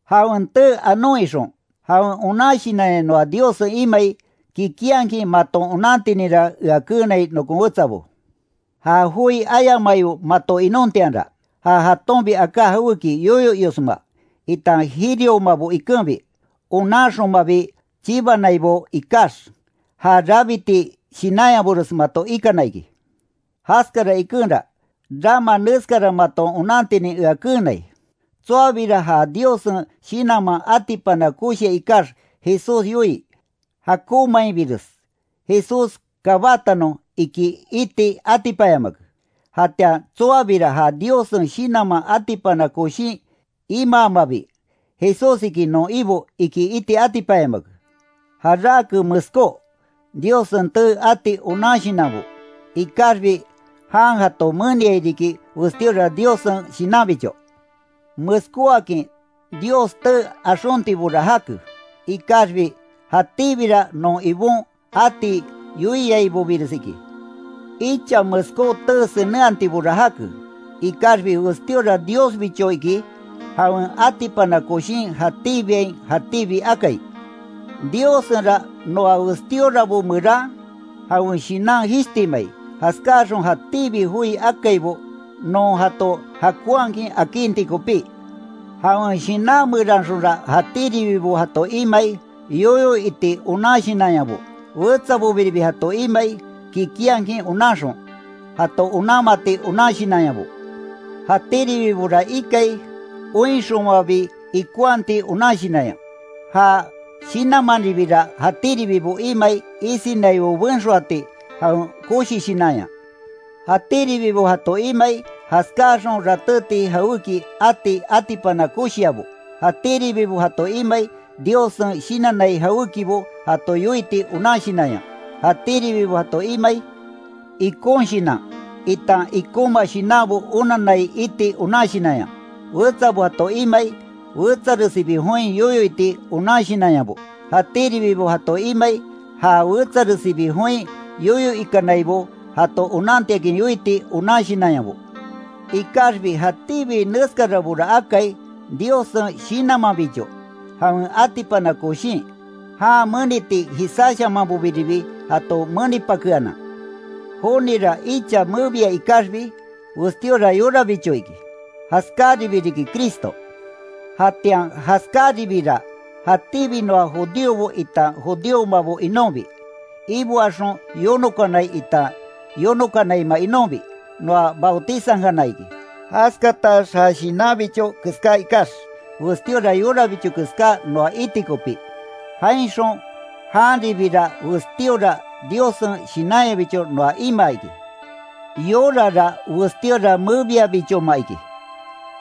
Jawen tee anon ixon, jawen onan Shinanya noa Diossen iamai, kikinhakin maton onantininra ea keenai nokon wetsabo. Ja joi ayamaibo mato inontianra, ja jatonbi aká jawéki yoyo iosma, itan jiriomabo ikenbi, onanxomabi chibanaibo ikax, já rabiti shinanyabores mato ikana iki. Jaskara ikenra, rama neskara maton onantinin ea keenai, tsoabira ja Diossen Shinanman atipana koshia ikax Jesús yoii: “¡Jakonmainbires Jesús kabatanon!” iki iti atipanyamake. Jatian tsoabira ja Diossen Shinanman atipana koshin imaamabi: “¡Jesús iki non Ibo!” iki iti atipanyamake. Jarake meskó, Diossen tee ati onan Shinanbo, ikaxbi jan jato meniai riki westíora Diossen Shinanbicho. Meskóakin Dios tee axontibora jake, ikaxbi jatíbira non Ibon ati yoiaibobires iki. Icha meskó tee senenhatibora jake, ikaxbi westíora Diosbicho iki, jawen atipana koshin jatíbiain jatíbi akai. Diossenra noa westíorabo meran, jawen Shinan jishtimai, jaskáaxon jatíbi joi akaibo, non jato jakonhakin akinti kopí. Jawen Shinan meranxonra jatíribibo jato imai, yoyo iti onan shinanyabo, wetsabobiribi jato imai, kikinhakin onanxon, jato onanmati onan shinanyabo, jatíribibora ikai, oinxonmabi ikonhati onan shinanya, ja Shinanmanribira jatíribibo imai isinaibo benxoati jawen koshi shinanya, jatíribibo jato imai, jaskáaxon ratéti jawéki ati atipana koshiabo, jatíribibo jato imai, Diossen shinannai jawékibo jato yoiti onan shinanya; jatíribibo jato imai, ikon shinan, itan ikonma shinanbo onanai iti onan shinanya; wetsabo jato imai, wetsaresibi join yoyo iti onan shinanyabo; jatíribibo jato imai, ja wetsaresibi join yoyo ikanaibo jato onantiakin yoiti onan shinanyabo. Ikaxbi jatíbi neskarabora akai, Diossen Shinanmanbicho, jawen atipana koshin, jan meniti jisáshamanbobiribi jato menipakeanan. Jonira icha mebia ikaxbi, westíora yorabicho iki, jaskáribi riki Cristo. Jatian jaskaribira, jatíbi noa judíobo itan judíomabo inonbi, iboaxon yonokanai itan yonokanaima inonbi, noa bautizankana iki, jaskatax ja shinanbicho keská ikax, westíora yorabicho keská noa iti kopí, jainxon janbiribira westíora Diossen Shinanyabicho noa imaa iki. Yorara westíora mebia bichoma iki,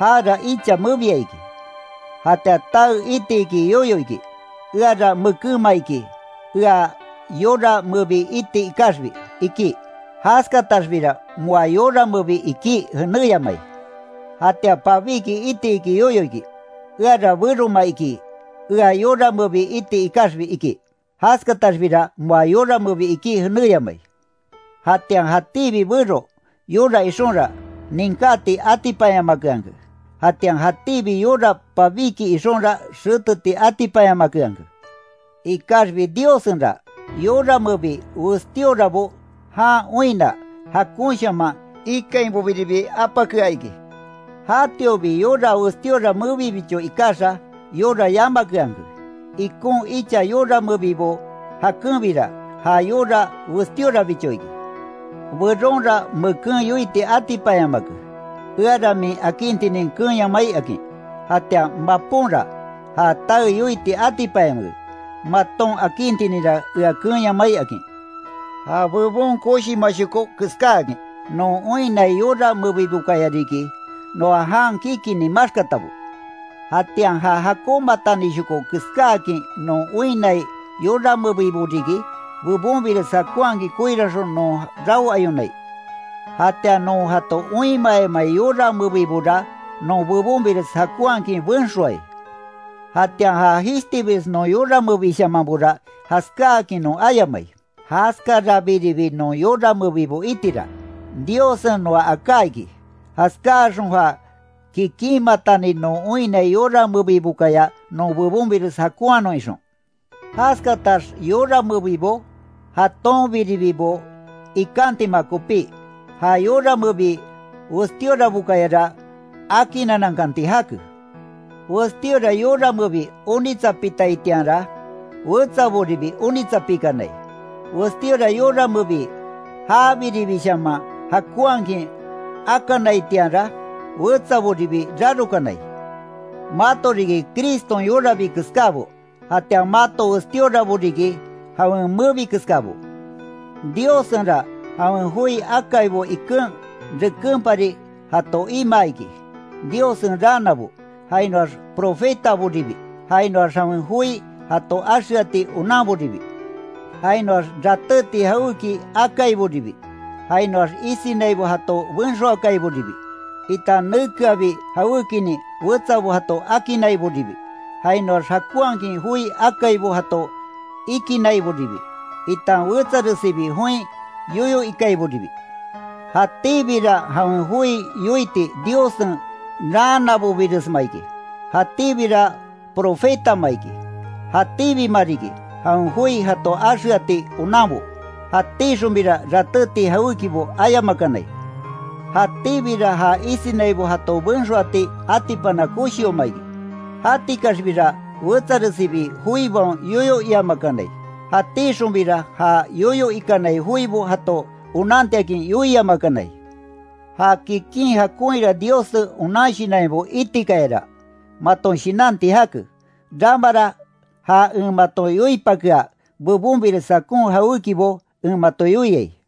jara icha mebia iki. Jatian tae iti iki yoyo iki: “Eara mekénma iki ea yora mebi iti ikaxbi”, iki. Jaskataxbira moa yora mebi ikí jenéyamai. Jatian pabíki iti iki yoyo iki: “Eara beroma iki, ea yora mebi iti ikaxbi”, iki. Jaskataxbira moa yora mebi ikí jenéyamai. Jatian jatíbi bero, yora ixonra, ninkáti atipanyamakeanke, jatian jatíbi yora pabíki ixonra xeteti atipanyamakeanke. Ikaxbi Diossenra, yora mebi westíorabo jan oinna, jakonshaman ikainbobiribi apakea iki. Jatiobi yora westíora mebibicho ikaxa, yora yamakeanke. Ikon icha yora mebibo jakenbira, ja yora westíorabicho iki. Beronra meken yoiti atipanyamake: “Eara min akintinin keenyamai”, akin. Jatian maponra, ja tae yoiti atipanyamake: “Maton akintininra ea keenyamai”, akin. Ja bebon koshimashoko keskáakin non oinnai yora mebibokaya riki, noa jan kikini maxkatabo. Jatian ja jakonmatanishoko keskáakin non oinnai yora mebibo riki, bebonbires jakonhakin koiranxon non raoayonai, jatian non jato oinmayamai yora mebibora non bebonbires jakonhakin benxoai. Jatian ja jishtibires non yora mebishamanbora, jaskáakin non ayamai. Jaskarabiribi non yora mebibo itira, Diossen noa aká iki, jaskáaxon ja kikinmatani non oinnai yora mebibokaya non bebonbires jakonhanon ixon, jaskatax yora mebibo, jatonbiribibo ikantima kopí, ja yora mebi westíorabokayara akinanankanti jake. Westíora yora mebi onitsapitaitianra wetsaboribi onitsapikanai, westíora yora mebi jabiribishaman jakonhakin akanaitianra, wetsaboribi rarokanai. Mato riki Criston yorabi keskábo, jatian mato westíorabo riki, jawen mebi keskabo. Diossenra jawen joi akaibo iken rekenpari jato imaa iki: Diossen raanabo, jainoax profetaboribi, jainoax jawen joi jato axeati onanboribi, jainoax ratéti jawéki akaiboribi, jainoax isinaibo jato benxoakaiboribi, itan nekeabi jawékinin wetsabo jato akinaiboribi, jainoax jakonhakin joi akaibo jato ikinaiboribi, itan wetsaresibi join yoyo ikaiboribi. Jatíbira jawen joi yoiti Diossen raanabobiresma iki, jatíbira profetama iki; jatíbima riki, jawen joi jato axeati onanbo; jatíxonbira ratéti jawékibo ayamakanai, jatíbira ja isinaibo jato benxoati atipana koshioma iki; jatikaxbira wetsaresibi joibaon yoyo iamakanai; jatíxonbira ja yoyo ikanai joibo jato onantiakin yoiamakanai. Ja kikin jakonhira Diossen onan shinanyabo itikayara, maton shinanti jake. Ramara ja en mato yoipakea, bebonbires jakon jawékibo en mato yoiai.